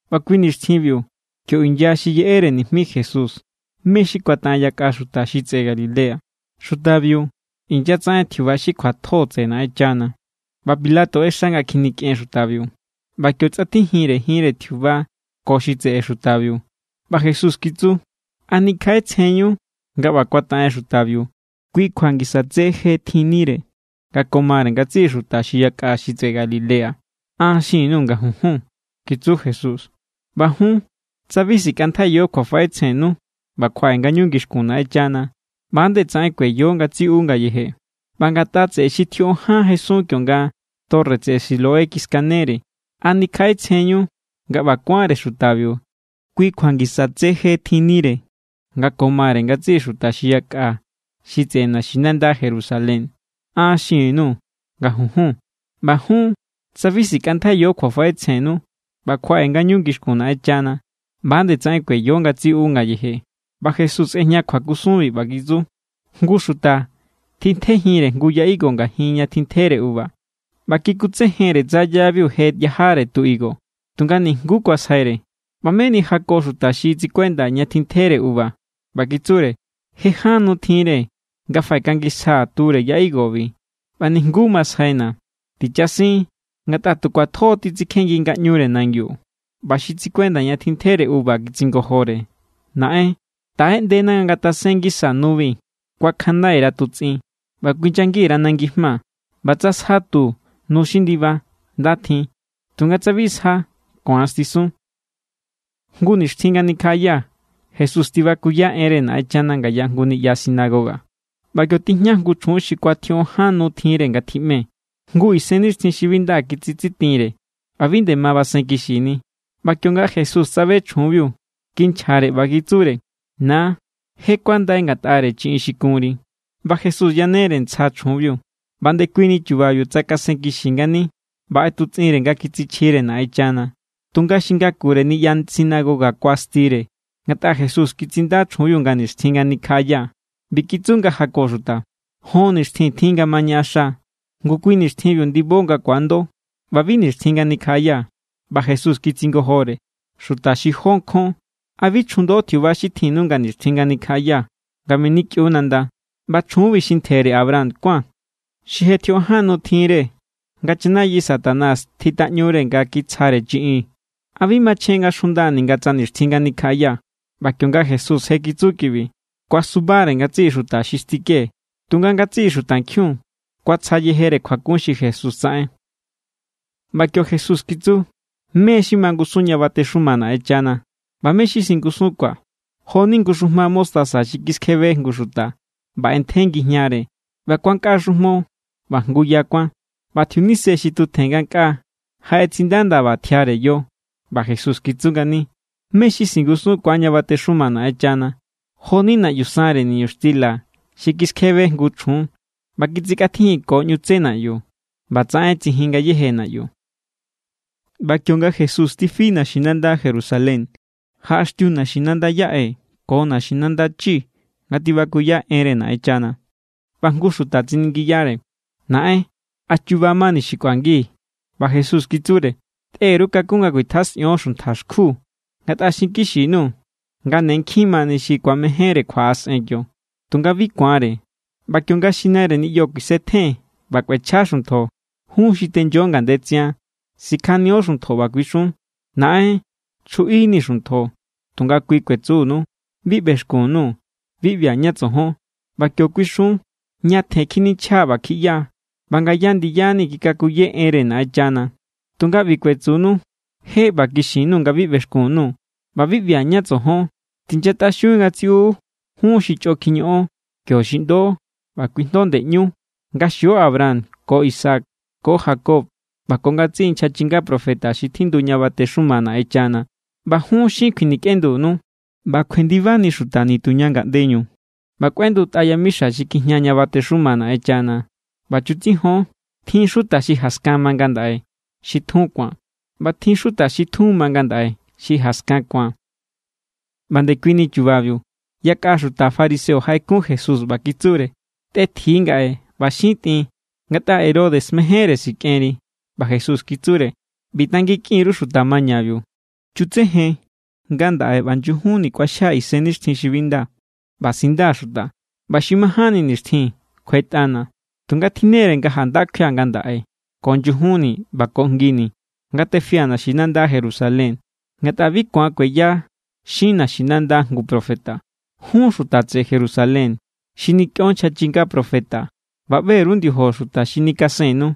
ꞌBa kui nixtjinbiu kio inya xi yeꞌere nijmi Jesús mé= xi kuataꞌen yakꞌa xuta xi tseꞌe Galilea. Xutabiu inyatsaꞌen tjiuba xi kjuatjo tseꞌe Naꞌenchana. ꞌBa Pilato ꞌexa nga kjinikꞌen xutabiu. ꞌBa kio tsꞌatjijinre jinre tjiuba ko xi tseꞌe xutabiu. ꞌBa Jesús kitsu: —¿A nikjaꞌetsjenñu nga ꞌba kuataꞌen xutabiu kui kjua ngisa tse je tjinnire nga ko mare ngatsiꞌi xuta xi yakꞌa xi tseꞌe Galilea? An xin_nuu̱ nga junjun —kitsu Jesús—. ꞌBa jun, tsa bi sikꞌantjaiyo kjuafaꞌetsjennu ꞌba kjuaꞌe ngañu ngixkun Naꞌenchana, ꞌba=nde tsaꞌen kueyo ngatsiꞌu ngayeje. ꞌBa ngatꞌa tseꞌe xi tjioꞌon ján jesun kionga torre tseꞌe Siloé kiskanere, ¿a nikjaꞌetsjenñu nga ꞌba kuánre xutabiu kui kjua ngisa tse je tjinnire nga ko mare ngatsiꞌi xuta xi yakꞌa xi tseꞌe naxinanda Jerusalén? An xin_nuu̱ nga junjun. ꞌBa jun, tsa bi sikꞌantjaiyo kjuafaꞌetsjennu ꞌba kjuaꞌe ngañu ngixkun Naꞌenchana, ꞌba=nde tsaꞌen kueyo ngatsiꞌu ngayeje. ꞌBa Jesús ꞌejña kjuakusunbi, ꞌba kitsu: —Jngu xuta tjintjejinre jngu ya higo ngajin ña tjintjere uva, ꞌba kikutsejenre tsa yabiu je yajare tu higo, tunga nijnguú kuasjaire. ꞌBa meni jako xuta xi tsikuenda ña tjintjere uva, ꞌba kitsure: “Je ján nu tjinre nga faꞌekangisjaa̱ ture ya higobi, ꞌba nijnguú masjaina̱. Tichasin, ngatꞌa tu kjuatjo= titsikjengi ngaꞌñure nangiu.” ꞌBa xi tsikuenda ña tjintjere uva kitsingojore: “Naꞌen, taꞌeꞌndena nga ngatasen ngisa nubi. Kuakjanndai_ra̱ tutsꞌin ꞌba kuinyangi_ra̱ nangi jma. ꞌBa tsa sja tu nu xi ndiba, nda tjin. Tunga tsa bi sja, ku̱an stisun.” Jngu nixtjin nga nikjaꞌaya, Jesús tibakuya enre Naꞌenchana ngaya jngu niꞌya sinagoga. ꞌBa kio tijña jngu chjun xi kuatjioꞌon ján nu tjinre nga tjiꞌme. Jngu isennixtjin xi bi nda kitsitsitinre ꞌba bi nde ma basen kixini. ꞌBa kionga Jesús tsabe chjunbiu, kinchjare ꞌba kitsure: —Na, je kuandai ngatꞌare chiꞌin xi kunri. ꞌBa Jesús yanere ntsja chjunbiu, ꞌba ndekuini chubabiu tsakasenkixi ngani ꞌba ꞌetutsꞌinre nga kitsichjire Naꞌenchana. Tunga xi ngakure niꞌya sinagoga kuastire, ngatꞌa Jesús kitsinda chjunbiu nga nixtjin nga nikjaꞌaya. ꞌBi kitsu nga jako xuta: —Jon nixtjin tjin nga ma ñaꞌaxa. Ngu kui nixtjinbiu ndibo nga ku̱ando, ꞌba bi nixtjin nga nikjaꞌaya. ꞌBa Jesús kitsingojore: —¡Xuta xi jó nkjon! ¿A bi chjundo tjiuba xi tjinnu nga nixtjin nga nikjaꞌaya, nga menikꞌiu nanda? ꞌBa chjunbi xi ntjere Abraham kuán, xi je tjioꞌon ján nu tjinre nga chanayi Satanás tjitaꞌñure nga kitsja chiꞌinre, ¿a bi machjen nga xjunda ninga tsa nixtjin nga nikjaꞌaya? ꞌBa kionga Jesús je kitsu kibi, kuasubare ngatsiꞌi xuta xi stike. Tunga ngatsiꞌi xutankjiun kuatsja yeje kjuakun xi Jesús tsaꞌen. ꞌBa kio Jesús kitsu: —¿Mé= xi mangusun ña batexuma Naꞌenchana? ꞌBa ¿mé= xi singusunkuaa̱? Jo=ni jngu xujma mostaza xi kiskjebe jngu xuta ꞌba ꞌentje ngijñare. ꞌBa kuankꞌa xujmo ꞌba jngu ya kuán, ꞌba tjiunise xi tutjen ngankꞌaa jaꞌetsindaꞌa ndaba tjiare yo. ꞌBa Jesús kitsu ngani: —¿Mé= xi singusunkuaa̱ ña batexuma Naꞌenchana? Jo=ni naꞌyu sanre niñuxtila xi kiskjebe jngu chjun ꞌba kitsikꞌatjijinko ꞌñu tsé naꞌyu. ꞌBatsaꞌen tsijin ngayéje naꞌyu. ꞌBa kionga Jesús tifi naxinanda Jerusalén, jaꞌaxtiu naxinanda yaꞌe ko naxinanda chi nga tibakuya enre Naꞌenchana. ꞌBa jngu xuta tsiningiyare: —Naꞌen, ¿a chuba mani xi kꞌuangi? ꞌBa Jesús kitsure: —Tꞌe_ru kakún nga kuitjasꞌion xuntja xkju. Ngatꞌa xinkixi_nuu̱ nga ne nkjin mani xi ku̱amejénre kjuaꞌasꞌen kio, tunga bi ku̱anre. ꞌBa kionga xi naire niꞌyo kuisetjen ꞌba kꞌuechja xuntjo, jun xi tenyo ngandetsian sikjanio xuntjo, ꞌba kuixun: “Naꞌen, chjuꞌinii̱ xuntjo.” Tunga kui kuetsunu: “Bi ꞌbexkun_nuu̱. Bi ꞌbia̱ ñá tsojon.” ꞌBa kio kuixun: “Ñatjen kjininchja ꞌba kjiꞌya, ꞌba ngaya ndiyani̱ kikakuye enre Naꞌenchana.” Tunga ꞌbi kuetsunu: “Je ꞌba kixin_nuu̱ nga bi ꞌbexkun_nuu̱ ꞌba bi ꞌbia̱ ñá tsojon. Tinyatꞌaxiun ngatsiꞌu, jun xi chꞌo kjiñoꞌon.” Kio xiꞌndo ꞌba kuijndo ndeꞌñú nga xio Abraham ko Isaac ko Jacob ꞌba ko ngatsiꞌi nchja chinga profeta xi tjindu ña batexuma Naꞌenchana. ꞌBa jun, xin kjuinikꞌendunu. ꞌBa kjuendibani xuta nituña ngaꞌndeñu ꞌba kꞌuendutꞌa yamixa xi kjijña ña batexuma Naꞌenchana. ꞌBa chutsijon, tjin xuta xi jaskan ma ngandaꞌe xi tjun ku̱an, ꞌba tjin xuta xi tjun ma ngandaꞌe xi jaskan ku̱an. ꞌBa ndekuini chubabiu yakꞌa xuta fariseo jaꞌekun Jesús, ꞌba kitsure: —Tꞌetji ngaꞌe ꞌba xin tꞌin, ngatꞌa Herodes mejénre sikꞌenri. ꞌBa Jesús kitsure: —ꞌBi tanginkꞌin_ru xuta mañabiu: “Chutsejen, ngandaꞌe ꞌba nyujunni kꞌuaxjia̱ isennixtjin xi bi nda ꞌba sindaa̱ xuta, ꞌba xi majánni nixtjin kjuetꞌana̱.” Tunga tjinnere nga janda kjuia̱ ngandaꞌe ko nyujunni ꞌba ko jngini, nga tefia̱ naxinanda Jerusalén. Ngatꞌa bi ku̱an kueya xin naxinanda jngu profeta. ’¡Jun xuta tseꞌe Jerusalén, xi nikꞌion nchja chinga profeta ꞌba ꞌbe_ru ndiojo xuta xi nikasennu!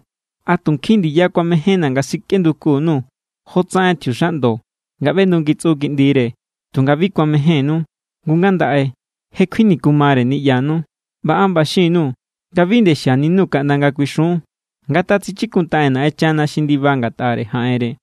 ¡A tu nkjin ndiya kuamejénna̱ nga sikꞌenduku_nuu̱ jotsaꞌen tjiuxaꞌndo nga ꞌbendungitsꞌu kiꞌndire, tunga bi kuamejénnu! Ngu ngandaꞌe, je kjuinikumare niꞌyanu. ꞌBa an ꞌba xin_nuu̱ nga bi nde xianinu kaꞌnda nga kuixun: “¡Ngatjatsichikuntaꞌen Naꞌenchana xi ndiba ngatꞌare jaꞌenre!”